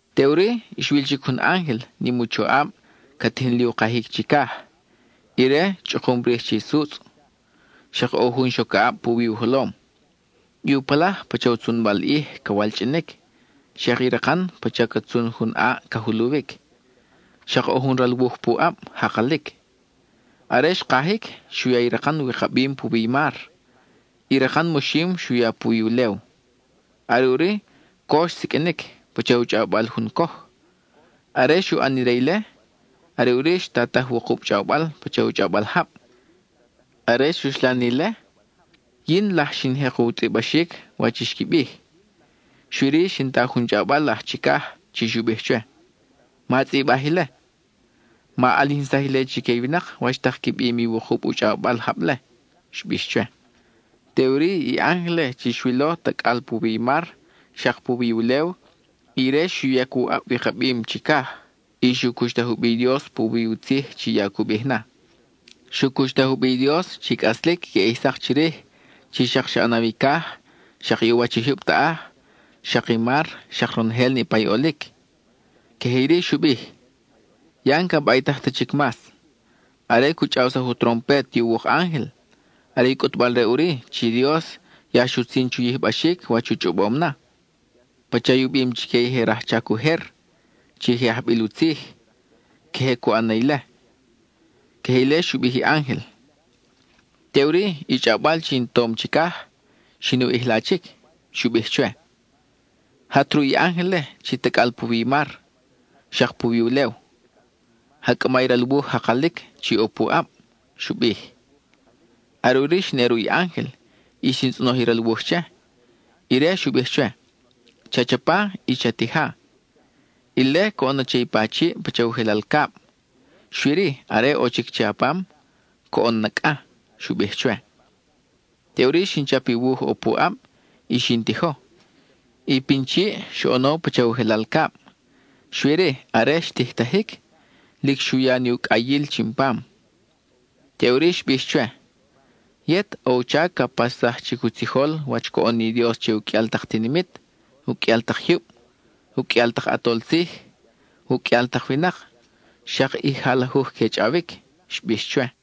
Teʼuri, xwil chic jun ángel, nim u choʼab, ca tijin li u kajic chicaj. Ire, chʼukum rij che i sutzʼ, xak ʼo jun xocaʼab puwi u jolom. I u palaj, pacha u tzunbal ʼij ca walchʼinic, xak i rakan, pacha ca tzun jun ʼaʼ ca juluwic. Xak ʼo jun ral wuj pu ʼab, jakalic. Are xkajic, xu ya i rakan wikabim puwi i mar; i rakan moxim xu ya puwi ulew. Are ʼuri, co xsiqʼuinic, pacha u chʼawbal jun coj. Are xu ʼan ire ile, are ʼuri xtataj wukub chʼawbal pacha u chʼawbal jab. Are xuxlan ile, yin laj xin jek u tzʼibaxic wach i xqui bij, xui-ri, xin ta jun chʼawbal aj chicaj chi xu bij chwe: —Ma tzʼibaj ile. Ma ʼalijinsaj chique i winak wach tak qui bim i wukub u chʼawbal jab-le —xbix chwe. Teʼuri i ángel-le chi xwilo tacʼal puwi i mar, xak puwi ulew, ire xu yac u ʼab wikabim chicaj, y xu cuxtaj u bi i Dios puwi u tzij chi ya cu bij na. Xu cuxtaj u bi i Dios chi cʼaslic queʼe ʼij sak chirij, chi xak xa ʼanaw i caj, xak i u wach i jyub taʼaj, xak i mar, xak ronojel niʼpa i ʼolic. Queje iri xu bij: —Ya n-ca baytaj ta chic mas. Are cu chʼawsaj u trompet i uwuk ángel, are i cʼutbal-re ʼuri chi Dios ya xutzin chu yijbaxic wach u chʼobom na. Pacha i u bim chique i je rajchac ujer, chi je ajbil u tzij, queje cu ʼan na ile. (Queje ile xu bij i ángel.) Teʼuri, i chʼawbal chi in tom chicaj, xin u ʼijla chic. Xu bij chwe: —Jat ruʼ i ángel-le chi tacʼal puwi i mar xak puwi ulew. Ja cʼama i ral wuj jakalic chi ʼo pu ʼab —xu bij. Are ʼuri xin ʼe ruʼ i ángel, y xin tzʼonoj i ral wuj che. Ire xu bij chwe: —Cha chapa y cha tija. Ile coʼon na che i pa chiʼ pacha u jelal cab, xui-ri, are ʼo chic che a pam, coʼon na cʼa —xu bij chwe. Teʼuri xin chap i wuj ʼo pu ʼab, y xin tijo. I pin chiʼ xoʼono pacha u jelal cab, xui-ri, are xtijtajic, lic xu ya ni u cʼayil chin pam. Teʼuri xbix chwe: —Yet, ʼo u chac ca paxsaj chic u tzijol wach coʼon ni Dios che u qʼuial tak tinimit, u qʼuial tak jyub, u qʼuial tak ʼatol tzij, u qʼuial tak winak, xak i jalajuj que chʼawic —xbix chwe.